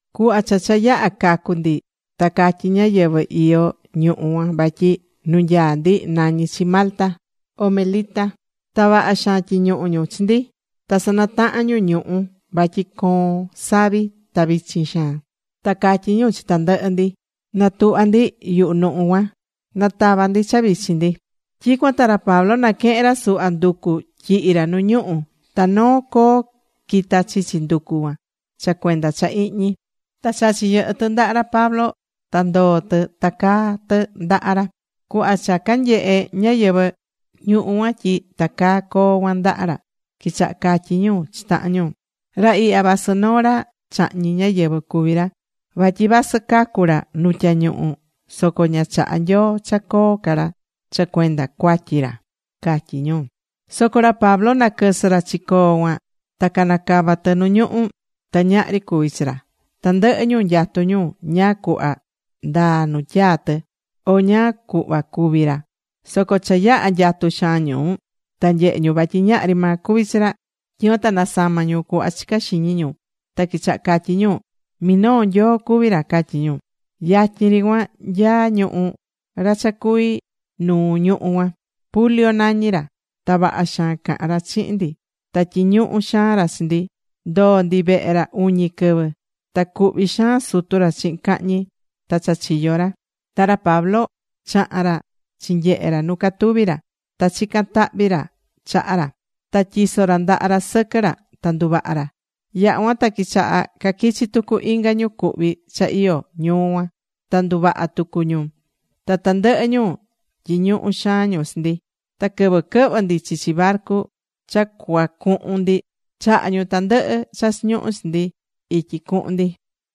Cuhva cha cha yaha̱ cacu ndi ta catyi ñáyɨvɨ iyó ñuhú cuan vatyi nu nyaá ndi nañí chi Malta, o Melita. Ta vaha xaan tyiñuhu̱ ñu chi ndi. Ta sanataha̱n ñu ñuhu̱ vatyi coón savi ta vichin xaan. Ta catyí ñu chi tandɨhɨ ndi, natuhva ndi yuhu ñuhu̱ cuan natava ndi cha vichin ndi. Tyicuan ta ra Pablo naquehe̱n ra suhva nducu tyihi̱ ra nu ñuhu̱. Ta noo coo quita̱ chichi nducu cuan, cha cuenda cha ihñi. Ta chachi̱ yɨhɨ tɨ ndaha ra Pablo ta ndoo̱ tɨ tacaa̱ tɨ ndaha ra. Cuhva cha canyehe ñáyɨvɨ ñuhú cuan tyi tacaá coo cuan ndaha ra, quichaha catyí ñu chi tahan ñu: ―Ra ihya vasɨ noo ra chahñi̱ ñáyɨvɨ cuví ra, vatyi vasɨ cacu̱ ra nu tyañuhu soco ña chahá Nyoo cha coo ca ra cha cuenda cuatyi ra ―catyí ñu. Soco ra Pablo naquɨsɨ ra chi coo cuan, ta canacava tɨ nu ñuhú, ta ñahri cuvi̱ chi ra. Tandɨhɨ ñu nyatú ñu ñáá cuhva ndaa nu tyaa̱ tɨ, o ñáá cuhva cúvi ra. Soco cha yaha̱ nyatu xaan ñu, ta nyehe̱ ñu vatyi ñahri maa cuvi̱ chi ra. Tyicuan ta nasama̱ ñu cuhva chicá xiñi ñu, ta quichaha catyí ñu: ―Minoo nyoo cuví ra ―catyí ñu. Yatyin ri cuan nyaá ñuhú ra cha cuví nuu ñuhú cuan. Publio nañí ra. Ta vaha xaan caha̱n ra chihin ndi. Ta tyiñuhu̱ xaan ra chi ndi, ndoo̱ ndi vehe ra uñi quɨvɨ. Ta cuhví xaan sutu ra chihin cahñi ta cha chiyó ra. Ta ra Pablo chaha̱n ra chinyehe̱ ra nu catuví ra. Ta chica̱n tahvi ra chaha ra. Ta tyiso̱ ra ndaha ra sɨquɨ ra ta nduvaha ra. Yaha̱ cuan ta quichaha caquichi̱ tucu inga ñu cuhví cha iyó ñuu cuan. Ta nduvaha̱ tucu ñu. Ta tandɨhɨ ñu tyiñuhu̱ xaan ñu chi ndi. Ta quɨvɨ quɨhvɨ̱ ndi chichi barcu cha cuacuhun ndi, chaha̱ ñu tandɨhɨ cha cuchiñuhu chi ndi ityi cuhun ndi.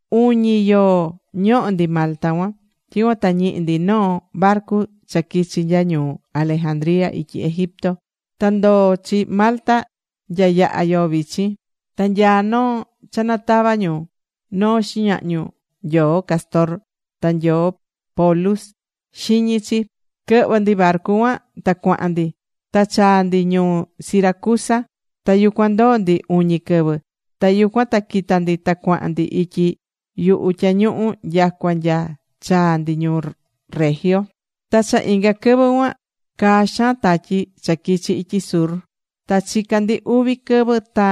Uñi yoo ñoho̱ ndi Malta cuan. Tyicuan ta ñihi̱ ndi noo barcu cha quichi nya ñuu Alejandría ityi Egipto. Ta ndoo̱ chi Malta nya yaha̱ yoo vichin. Ta nyaa noo cha natava ñu, noo xiñahñu nyoo Cástor ta nyoo Pólux, xiñi chi. Quɨhvɨ̱ ndi barcu cuan ta cuahan ndi. Ta chaa̱ ndi ñuu Siracusa. Ta yucuan ndoo̱ ndi uñi quɨvɨ. Ta yucuan ta quita̱ ndi ta cuahan ndi ityi yuhu tyañuhu nyacua nya chaa̱ ndi ñuu Regio. Ta cha inga quɨvɨ cuan caa xaan tatyi cha quichi ityi sur ta chica̱ ndi uvi quɨvɨ ta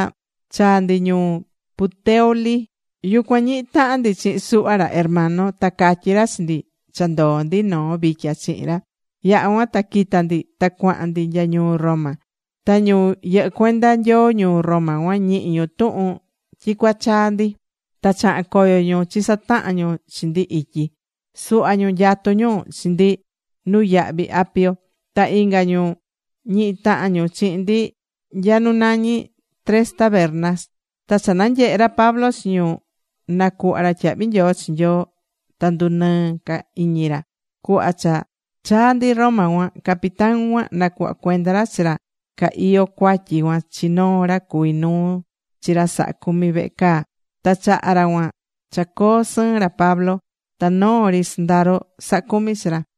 chaa̱ ndi ñuu Puteoli. Yucuan ñihi̱ tahan ndi chihin suhva ra hermano. Ta catyí ra chi ndi cha ndoó ndi noo vitya chihin ra. Yaha̱ cuan ta quita̱ ndi ta cuahan ndi nya ñuu Roma. Ta ñu yɨhɨ́ cuenda Nyoo ñuu Roma cuan ñihi̱ ñu tuhun tyi cua chaa ndi. Ta chaha̱n coyo ñu chisataha̱n ñu chi ndi ityi. Suhva ñu nyatú ñu chi ndi Nuyahví Apio. Ta inga ñu ñihi̱ tahan ñu chihin ndi nya nu nañi Tres Tabernas. Ta cha nanyehe̱ ra Pablo chi ñu, nacuhva̱ ra tyahvi nyoo chi Nyoo. Ta ndunɨɨ ca iñi ra. Cuhva cha chaa̱ ndi Roma cuan, capitán cuan nacuhva̱ cuenda ra chi ra ca iyó cuatyi cuan chi noo ra cuví nuu chi ra sahá cumi vehe caa. Ta chaha̱ ra cuan cha coo sɨɨn ra Pablo. Ta noo ri sɨndaro sahá cumi chi ra.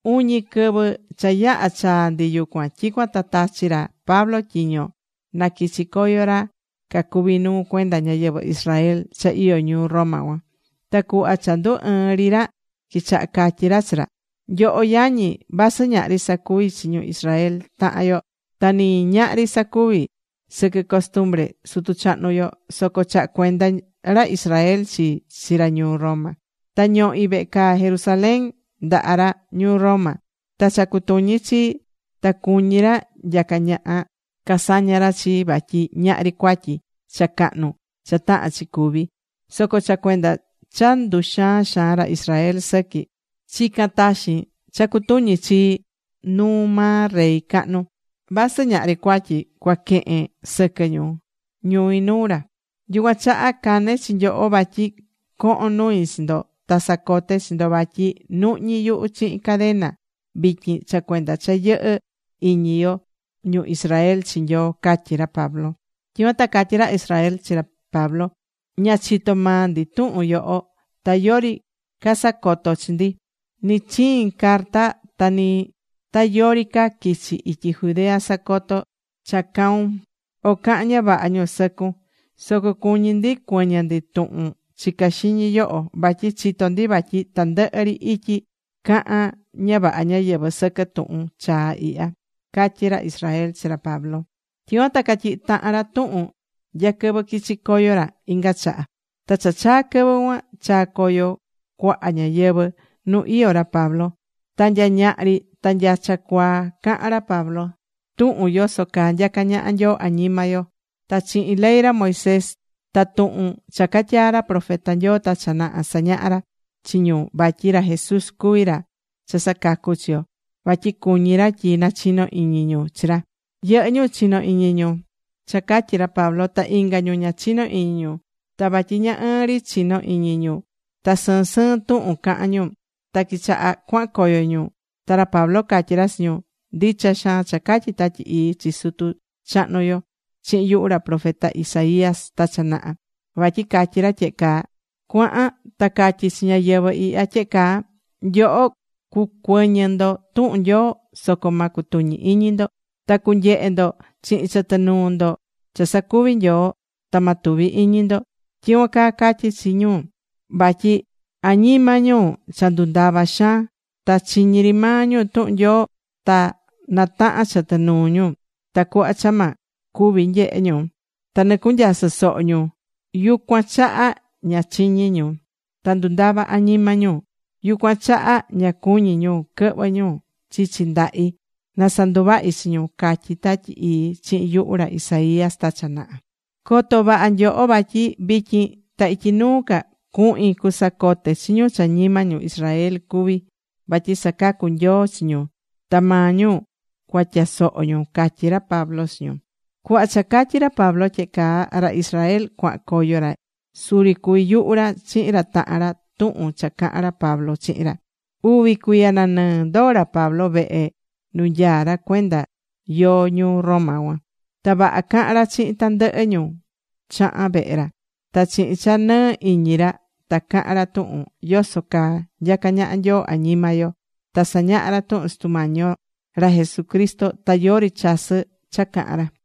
Uñi quɨvɨ cha yaha̱ chaa̱ ndi yucuan. Tyicuan ta tachi̱ ra Pablo tyiño naquichí coyo ra cacuví nuu cuenda ñayɨvɨ Israel cha iyó ñuu Roma cuan. Ta cuhva cha ndu ɨɨn ri ra, quichaha catyi̱ ra chi ra: ―Nyoho yañi, vasɨ ñahri sacuvi̱ chi ñu Israel tahan yo, ta ni ñahri sacuvi̱ sɨquɨ costumbre sutu chahnu yo, soco chaha̱ cuenda ra Israel chii chi ra ñuu Roma. Ta ñohi̱ vehe caa Jerusalén ndaha ra ñuu Roma. Ta cha cutuñí chi, ta cuñí ra nyacá ñaha casaña ra chii. Vatyi ñahri cuatyi cha cahnu cha tahán chi cúví. Soco cha cuenda cha nduxaán xaan ra Israel sɨqui, chica̱n taxin cha cutuñi chii nuu maa rey cahnu. Vasɨ ñahri cuatyi cuacaquen sɨquɨ ñu ñui nuu ra. Yucuan chaha cane̱ chi nyoho vatyi cohon nui chi ndo, ta sacoté chi ndo vatyi nuhñí yuhu chihin cadena vityin cha cuenda cha yɨhɨ́ iñi yo, ñu Israel, chi Nyoo ―catyí ra Pablo. Tyicuan ta catyí ra Israel chi ra Pablo: ―Ña chitó maa ndi tuhun yoho. Ta yori casacoto̱ chi ndi, ni chihin carta, ta ni ta yori ca quichi̱ ityi Judea sacoto cha caun, o caha̱n ña vaha ñu sɨcun. Soco cuñí ndi cuɨñɨ ndi tuhun chicá xiñi yoho. Vatyi chitó ndi vatyi tandɨhɨ ri ityi cahán ña vaha ñáyɨvɨ sɨquɨ tuhun chaa ihya ―catyí ra Israel chi ra Pablo. Tyicuan ta catyihi̱ tahan ra tuhun nya quɨvɨ quichi coyo ra inga chaha. Ta cha chaa̱ quɨvɨ cuan, chaa̱ coyo cuaha ñáyɨvɨ nu iyó ra Pablo. Ta nya ñaha ri ta nya cha cuaa cahán ra Pablo tuhun yoso caa nyacá ñaha Nyoo añima yo. Ta chihin ley ra Moisés ta tuhun cha catyaa̱ ra profeta Nyoo ta cha naha, sañahá ra chi ñu vatyi ra Jesús cuví ra cha sacacú chi yo, vatyi cuñi ra tyi nachino iñi ñu chi ra. Yɨhɨ́ ñu chinó iñi ñu cha catyí ra Pablo. Ta inga ñu ña chinó iñi ñu. Ta vatyi ña ɨɨn ri chino iñi ñu ta sɨɨn sɨɨn tuhun cahán ñu, ta quichaha̱ cuahan coyo ñu. Ta ra Pablo catyí ra chi ñu: ―Ndicha xaan cha catyi̱ Tatyi Ii chi sutu chahnu yo chihin yuhu ra profeta Isaías ta cha naha. Vatyi catyí ra tyehe caa: Cua̱han ta ca̱tyi chi ñáyɨvɨ ihya tyehe caa: Nyoho cucuɨñɨ ndo tuhun Nyoo. Soco ma cutuñi iñi ndo. Ta cunyehe ndo chihin chɨtɨ nuu ndo cha sacuví Nyoo. Ta ma tuvi iñi ndo. Tyicuan caa catyí chi ñu. Vatyi añima ñu cha ndundava̱ xaan. Ta chiñí ri maa ñu tuhun Nyoo. Ta natahán chɨtɨ nuu ñu, tacuhva cha ma cuvi nyehe ñu. Ta nɨcunyasɨ́ soho ñu. Yucuan chaha ña chiñí ñu, ta ndundava̱ añima ñu. Yucuan chaha ña cuñí ñu quɨhvɨ ñu chichi ndahi na sanduvahi chi ñu, catyí Tatyi Ii chihin yuhu ra Isaías ta cha naha. ’Co̱to vaha nyoho vatyi vityin ta ityi nuu ca cuhin cusacote chi ñu cha ñima ñu Israel cuví vatyi sacacú Nyoo chi ñu. Ta maa ñu cuatyasoho ñu, ―catyí ra Pablo chi ñu. Cuhva cha catyi̱ ra Pablo tyehe caa, ra Israel cuahan coyo ra suri cuví yuhu ra chihin ra tahan ra tuhun cha cahan ra Pablo chihin ra. Uvi cuiya nanɨɨ ndoo̱ ra Pablo vehe nu nyaá ra cuenda yoo ñuu Roma cuan. Ta vaha cahán ra chihin tandɨhɨ ñu chaha̱n vehe ra. Ta chihin cha nɨɨ iñi ra ta cahan ra tuhun yoso caa nyacá ñaha Nyoo añima yo. Ta sañahá ra tuhun Sutu Mañi yo ra Jesucristo. Ta yori chasɨ́ cha cahán ra.